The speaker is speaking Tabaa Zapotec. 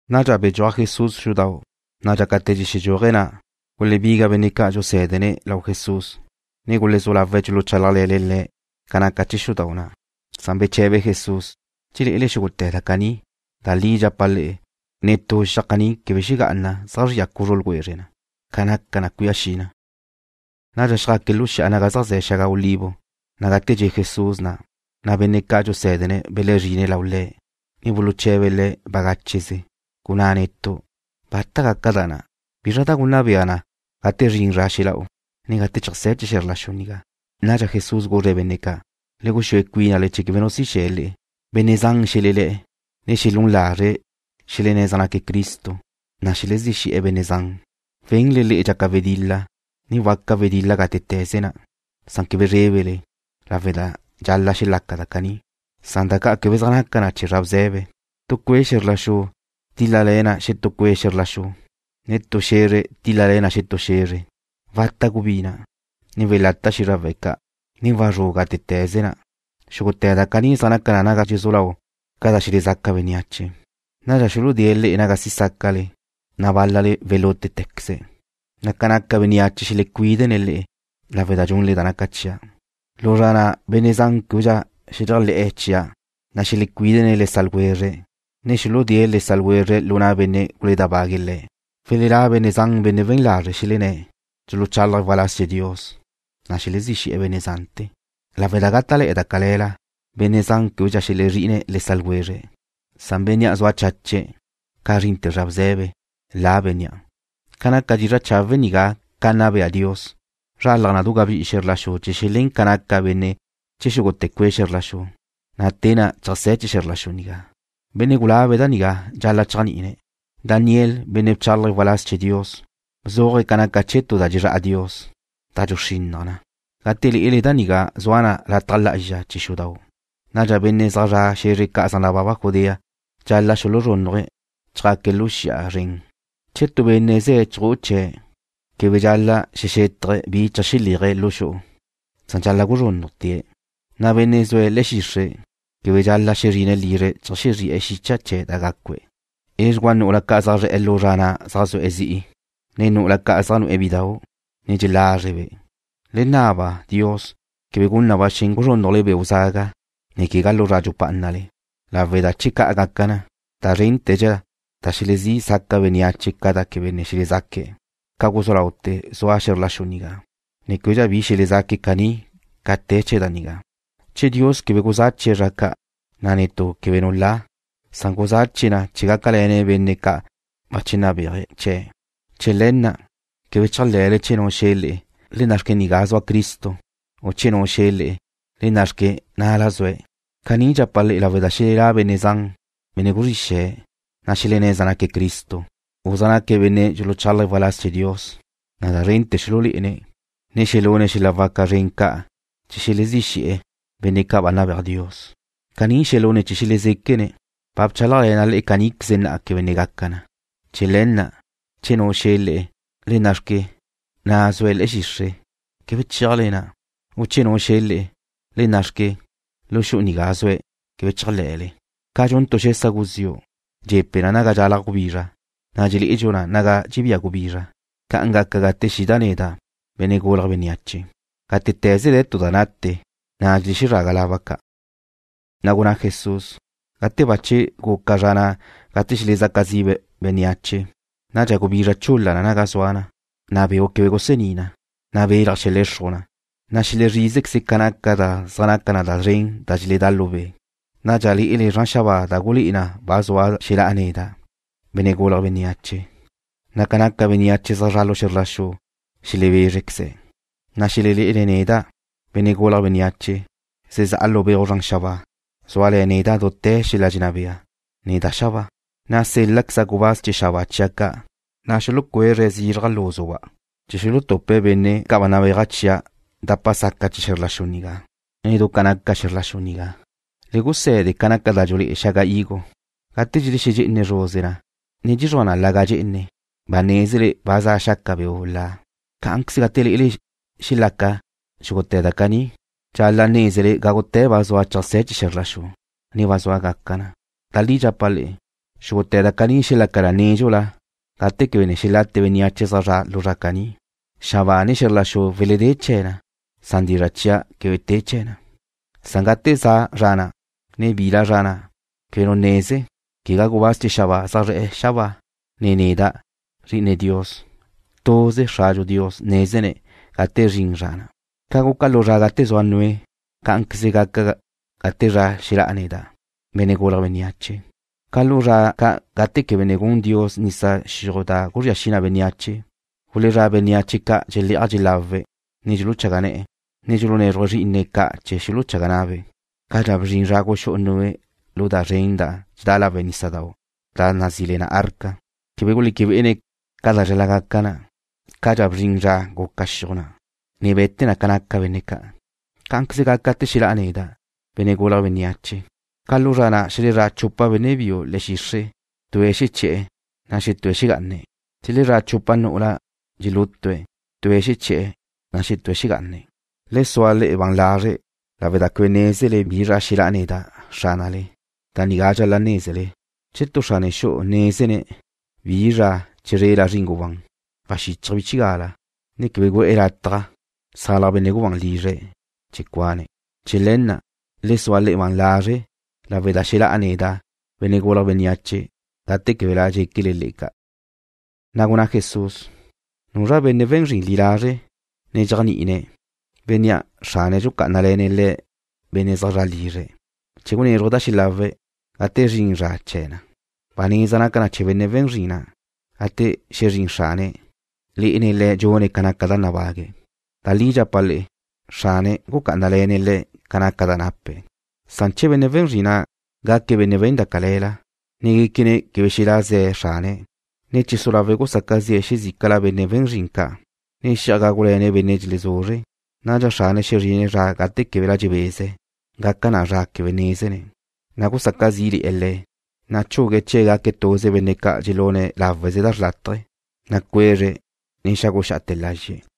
Nadxa bedxúaj Jesús xudau', na' dxácate̱ dxexedxúaje̱' na', gulebiga benne' ca' dxusé̱dene̱' lau Jesús, ne gulezú lawe̱' dxuluchálajle̱ne̱' Le̱' ca naca chee̱ xudau' na'. Beche̱be Jesús: ―¿Dxelé'ele xúgute̱ da caní? Da li dxapa' le'e, netú xiaj caní quebe xegá'ana zeajzría cuzru ljwezre na. Ca naca na cuía xi na. Nadxa xjaque̱' lu xi'a naga zaj ze̱ xaga olivo, na' gate dxe' Jesús na', benne' ca' dxusé̱dene̱' belezrine̱' lau Le̱', ne bagácheze buluche̱be̱' Le̱': ―Gunná netu'. ¿Bata gaca da na'? ¿Bi gunna bea na gate zrin zra xela'u, ne gate cheajsé̱ chee̱ xe̱zr la xu nigá? Nadxa Jesús guzre̱' benne' ca': ―Le guxúe cuínale chee̱ quebe nu si xe̱ le'e. Benne' zan xelelé̱'e̱. Xelún lazre̱' xelenné̱' zaj naque̱' Cristo, na' xelezí xe̱'e̱ benne' zan. Wenle le'e dxaca wedil-la, ne waca wedil-la gátete̱ze na'. Quebe zrébele, lawe' da dxal-la' xelaca da caní. Da caní quebe zaj naca na chee̱ zra bze̱be. Tu cue' xe̱zr la xu tíl-lale̱ na xetú cue' xe̱zr la xu, ne tu xe̱zre tíl-lale̱ na xetú xe̱zre. Wata' gubina', ne welata' xízrawe̱' ca', ne wazrú' gátete̱ze na'. Xúgute̱ da caní zaj naca na naga dxezú lau ca da xelezaca bénneache. ’Nadxa xuludée̱' le'e naga si sácale, na' bál-lale welútequeze̱'. Ca naca bénneache xelecuídene̱' le'e lawe' da dxunle da naca chia'. Lu zra na' benne' zan québedxa xeléajle̱'e̱ chia', na' xelecuídene̱' le sa' ljwezre̱', ne xuludée̱' le sa' ljwezre̱' lu na' benne' guledábague̱' le̱'. Welelá' benne' zan benne' we̱n lazre'. Xelenné̱' dxuluchálaje̱' waláz chee̱ Dios, na' xelezí xe̱'e̱ benne' zante̱. Lawe' da gáta'le̱'e̱ da cale̱la, benne' zan québedxa xelezrí'ine̱' le sa' ljwezre̱'. Bénnea' zua chache̱' ca zrinte̱ zra bze̱be, la bénnea'. Ca naca dizra' chawe' nigá ca nna bea Dios, zralaj na du gabí'i xe̱zr la xu chee̱ xelén ca naca benne' chee̱ xúgute̱ cue' xe̱zr la xu, na' te na' cheajsé̱ chee̱ xe̱zr la xu nigá. ’Benne' gulabe̱' da nigá dxal-la' chéajni'ine̱'. Daniel, benne' bchálaje̱' waláz chee̱ Dios, bzuaje̱' ca naca chee̱ tu da dxezrá'a Dios, da dxuxrinnaj na. Gate lé'ele da nigá zua na lataj lá'azxa chee̱ xudau', nadxa benne' zaj zre̱'e̱ xe̱zre ca' zaj nababa Judea dxal-la' xuluzrúnnuje̱', ne chjaque̱' lu xi'a zren. Che tu benne' ze̱' chju'u chee̱', quebe dxal-la' xexétaje̱' bi cheajxeléaje̱' lu xu'u. Dxal-la' guzrúnnujte̱'. Benne' zue̱' le̱'e̱ xixre' quebe dxal-la' xezrine̱' lizre̱' cheajxezri'e̱ xicha chee̱' da gácue̱'. Edxugúa nu'ula ca' zaj zre̱'e̱ lu zra na' zaj zue̱' zi'i, ne nu'ula ca' zaj nu'e̱ bidau', ne dxelázrebe'. Le naba Dios quebe gun na ba xen guzrúnnujle beu' zaga, ne quegá lu zra dxupá'anale, lawe' da che ca' gaca na, na' da zrénte̱dxa da xelezí saca bénneache ca da quebe ne xelezaque̱' ca guzú laute̱ zua xe̱zr la xu nigá, ne québedxa bi xelezaque̱' caní ca te chee̱ da nigá. Che Dios quebe guzáchie̱' zra ca', na' netú quebe nu la. Guzáchie̱' na chee̱ gácale̱ne̱' benne' ca' bache nabéaje̱' chee̱'. ’Chee̱ le̱ na', quebe chéajle̱le che nu xe̱ le'e: “Le nna'xque, nigá zua Cristo”, u che nu xe̱ le'e: “Le nna' xque, na'la zue̱'.” Caní dxapa' le'e lawe' da xelelá' benne' zan, benne' guzrí xe̱'e̱, na' xelenné̱' zaj naque̱' Cristo, u zaj naque̱' benne' dxuluchálaje̱' waláz chee̱ Dios, na' da zrente̱ xululé'ene̱', ne xelune̱' xel-la' waca zren ca' chee̱ xelezí xe̱'e̱ benne' ca' ba nabéaj Dios. Caní xelune̱' che xelezéquene̱'. Ba bchálajle̱na' le'e caníqueze na'a quebe ne gaca na. Chee̱ le̱ na', che nu xe̱ le'e: “Le nna'xque, na' zue̱' le̱'e̱ xixre'”, quebe chéajle na', u che nu xe̱ le'e: “Le nna'xque, lu xu'u nigá zue̱'”, quebe chéajle̱le. Ca dxun tu xesa guziu', dxe̱pe na naga dxalaj gubizra, na' dxelé'edxu na naga dxebía gubizra, ca'an gaca gate xida' neda', Benne' Gulje̱' Bénneache. Gátete̱ze de̱ tu da nate, na' dxelexezraga laba ca'. Na' gunná Jesús: ―Gate bache guca zra na' gate xelezaca zi' bénneache, nadxa gubizra chul-la na naga zua na, na' beu' quebe gusení na, na' belaj xelexruj na, na' xelezrízequeze ca naca da zaj naca na szren da dxeledá' lu be'. Nadxa lé'ele zran xabáa da gulé'e na ba zua xelá'a neda', Benne' Gulje̱' Bénneache, na' ca naca bénneache zaj zre̱'e̱ xe̱zr la xu xelebézrequeze̱'. Nadxa xelelé'ene̱' neda', Benne' Gulje̱' Bénneache, zezá'a lu beuj zran xabáa, zúale̱ neda' dute̱ xel-la' dxenná bea, ne da xabáa. Nadxa sél-laqueza' gubáz chee̱ xabáa chia' ca', na' xulucuézre̱' zizraj lúzuba' chee̱ xuluxutupe̱' benne' ca' ba nabéaja' chia' dapa saca chee̱ xe̱zr la xu nigá, ne du ca naca xe̱zr la xu nigá. ’Le guse̱de ca naca da dxulé'e xaga higo. Gate dxelexedxé'ene zruze na, ne dxezría na laga' dxe'ene, ba nézele ba za xaca beu' la. Cá'anqueze gate lé'ele dxelaca xúgute̱ da caní, dxal-la' nézele gágute̱ ba zua cheajsé̱ chee̱ xe̱zr la xu, ne ba zua gaca na. Da li dxapa' le'e, xúgute̱ da caní xelaca na nédxula gate quebe ne xelate bénneache zaj zre̱'e̱ lu zra na'. Xabáa ne xe̱zr la xu weledé chee̱ na. Dizra' chia' quebe te chee̱ na. ’Gate za zra na', ne bila zra na', quebe nu neze, quegá gubáz chee̱ xabáa zaj zre̱'e̱ xabáa, ne neda', Zri'ine Dios. Tuze Xradxu Dios nézene̱' gate zrin zra na'. ’Ca guca lu zra ca' gate zua Noé, cá'anqueze gaca na gate xelá'a neda', Benne' Gulje̱' Bénneache. Ca lu zra ca' gate quebe ne gun Dios nisa xiuj da guzría xi na bénneache, gulezrá' bénneache ca' dxelé'aj dxelawe̱', ne dxuluchaga ne̱'e̱, ne dxulunézruje̱' zrí'ine̱' ca' chee̱ xuluchaga na'be', cadxa bzrin zra guxú'u Noé lu da zren na' dxedá lawe' nísadau' da nazí le na arca. Quebe guleque bé'ene̱' ca da dxal-la' gaca na, cadxa bzrin zra guca xiuj na', ne be̱te na ca naca benne' ca'. Cá'anqueze gaca gate xelá'a neda', Benne' Gulje̱' Bénneache. Ca lu zra ca' xelezrá' chupa benne' biu le̱'e̱ xixre'. Tue̱' xeché̱'e̱, na' xetúe̱' xegá'ane̱'. Xelezrá' chupa nu'ula dxelútue̱'. Tue̱' xeché̱'e̱, na' xetúe̱' xegá'ane̱'. ’Le sua le'e ban lazre' lawe' da quebe nézele bi zra xelá'a neda', Xránale. Da nigá dxal-la' nézele: Che tu xrane xu'u nézene̱' bi zra chizrela zrin gubán, waxíchaje̱' bchigala, ne quebe gu'e̱ lataj xusalaj benne' gubán lizre̱' chee̱ cuane̱'. Chee̱ le̱ na', le sua le'e ban lazre' lawe' da xelá'a neda', Benne' Gulje̱' Bénneache, gate québela dxéquele ca'. Na' gunná Jesús: ―¿Nuzra na' benne' we̱n zrin li lazre' ne dxéajni'ine̱', bénnea' xrane̱' dxucá'anale̱ne̱' le̱' benne' zaj zre̱'e lizre̱' chee̱ gunézruje̱' da xelawe̱' gate zrin zra chee̱ na? Ba neza naca na chee̱ benne' we̱n zrin na', gate xezrín xrane̱', lé'ene̱' le̱' dxune̱' ca naca da nabague̱'. Da li dxapa' le'e, xrane̱' gucá'anale̱ne̱' le̱' ca naca da nape̱'. Che benne' we̱n zrin na' gaque̱' benne' we̱n da cale̱la, ne guéquene̱' quebe xelá' ze̱ xrane̱', ne che su lawe̱' gusaca zi'e̱ xezícala benne' we̱n zrin ca', ne xi'aj gágule̱ne̱' benne' dxelezuzre̱', nadxa xrane̱' xezrine̱' zra gate québela dxebeze̱'. Gaca na zra quebe nézene̱', na' gusaca zí'le̱'e̱ le̱'. Chugue̱' chee̱' gaque̱' tuze benne' ca' dxelune̱' láweze da xrlátaje. Cuezre̱', ne xáguxa'ate̱ lazxe̱'.